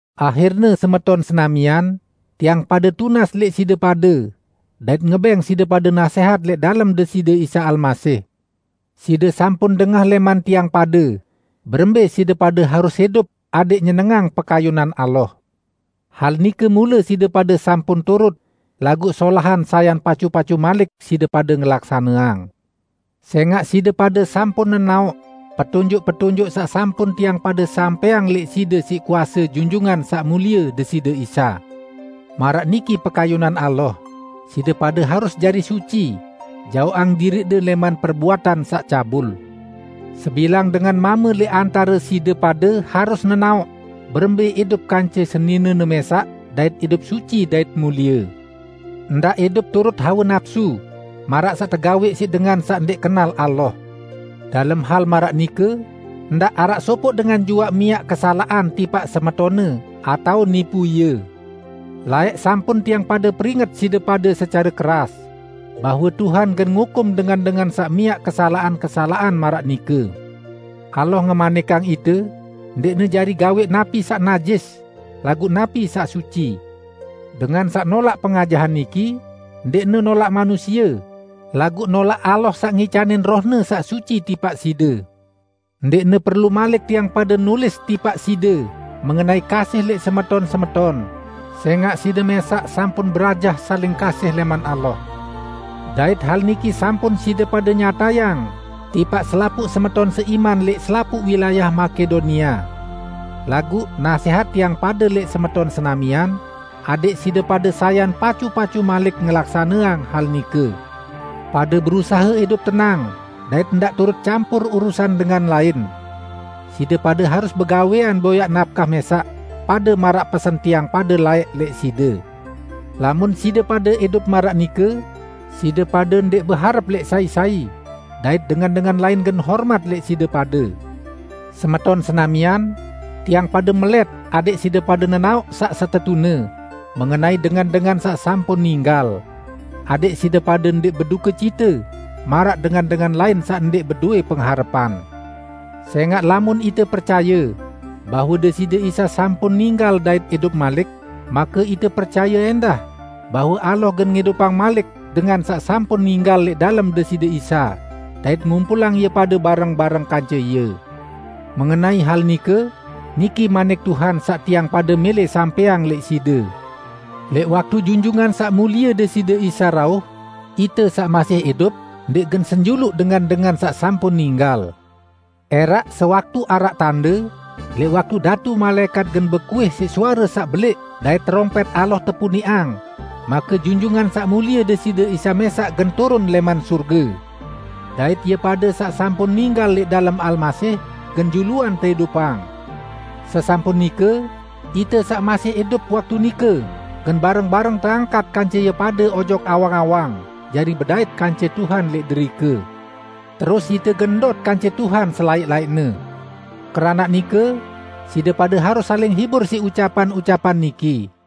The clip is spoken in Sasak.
Ahirne semeton senamian, tiang pade tunas lẽq side pade dait ngebẽng side pade nasẽhat lẽq dalem Deside Isa Almasih: Side sampun dengah lẽman tiang pade berembẽ side pade harus idup adẽq nyenengang pekayunan Allah. Hal nike mule side pade sampun turut, laguq solahan sayan pacu-pacu malik side pade ngelaksaneang. Sẽngaq side pade sampun nenaoq petunjuk-petunjuk saq sampun tiang pade sampẽang lẽq side siq kuase Junjungan Saq Mulie Deside Isa. Maraq niki pekayunan Allah, side pade harus jari suci, jaoqang diriqde lẽman perbuatan saq cabul. Sebilang dengan mame lẽq antare side pade harus nenaoq berembẽ idup kance seninene mẽsaq dait idup suci dait mulie. Ndaq idup turut hawe napsu, maraq saq tegawẽq siq dengan saq ndẽq kenal Allah. Dalem hal maraq nike, ndaq araq sopoq dengan juaq miaq kesalaqan tipaq semetonne, atao nipu ie. Laẽq sampun tiang pade peringet side pade secare keras, bahwe Tuhan gen ngukum dengan-dengan saq miaq kesalaqan-kesalaqan maraq nike. Allah ngemanikang ite, ndẽqne jari gawẽq napi saq najis, laguq napi saq suci. Dengan saq nolaq pengajahan niki, ndẽqne nolaq manusie, laguq nolaq Allah saq ngicanin Roh-Ne saq suci tipaq side. Ndẽqne perlu malik tiang pade nulis tipaq side mengenai kasih lẽq semeton-semeton, sẽngaq side mẽsaq sampun berajah saling kasihin lẽman Allah. Dait hal niki sampun side pade nyatayang tipaq selapuq semeton seiman lẽq selapuq wilayah Makedonia. Laguq, nasẽhat tiang pade lẽq semeton senamian, adẽq side pade sayan pacu-pacu malik ngelaksaneang hal nike. Pade berusahe idup tenang dait ndaq turut campur urusan dengan lain. Side pade harus begawẽan boyaq napkah mẽsaq, pade maraq pesen tiang pade laẽq lẽq side. Lamun side pade idup maraq nike, side pade ndẽq beharep lẽq sai-sai, dait dengan-dengan lain gen hormat lẽq side pade. Semeton senamian, tiang pade melẽt adẽq side pade nenaoq saq setetune mengenai dengan-dengan saq sampun ninggal; adẽq side pade ndẽq bedukecite maraq dengan-dengan lain saq ndẽq bedowẽ pengharepan. Sẽngaq lamun ite percaye bahwe Deside Isa sampun ninggal dait idup malik, make ite percaye ẽndah bahwe Allah gen ngidupang malik dengan saq sampun ninggal lẽq dalem Deside Isa, dait ngumpulang ie pade bareng-bareng kance Ie. Mengenai hal nike, niki manik Tuhan saq tiang pade mẽlẽ sampẽang lẽq side: Lẽq waktu Junjungan Saq Mulie Deside Isa rauh, ite saq masih idup ndẽq gen senjuluq dengan-dengan saq sampun ninggal. ~Eraq sewaktu araq tande, lẽq waktu datu malaẽkat gen bekuih siq suare saq belẽq dait terompẽt Allah tepuniqang, make Junjungan Saq Mulie Deside Isa mẽsaq gen turun lẽman sorge, dait ie pade saq sampun ninggal lẽq dalem Almasih gen juluan teidupang. Sesampun nike, ite saq masih idup waktu nike gen bareng-bareng teangkat kance ie pade ojok awang-awang jari bedait kance Tuhan lẽq derike. Terus ite gen ndot kance Tuhan selaẽq-laẽqne. Keranaq nike, side pade harus saling hibur siq ucapan-ucapan niki.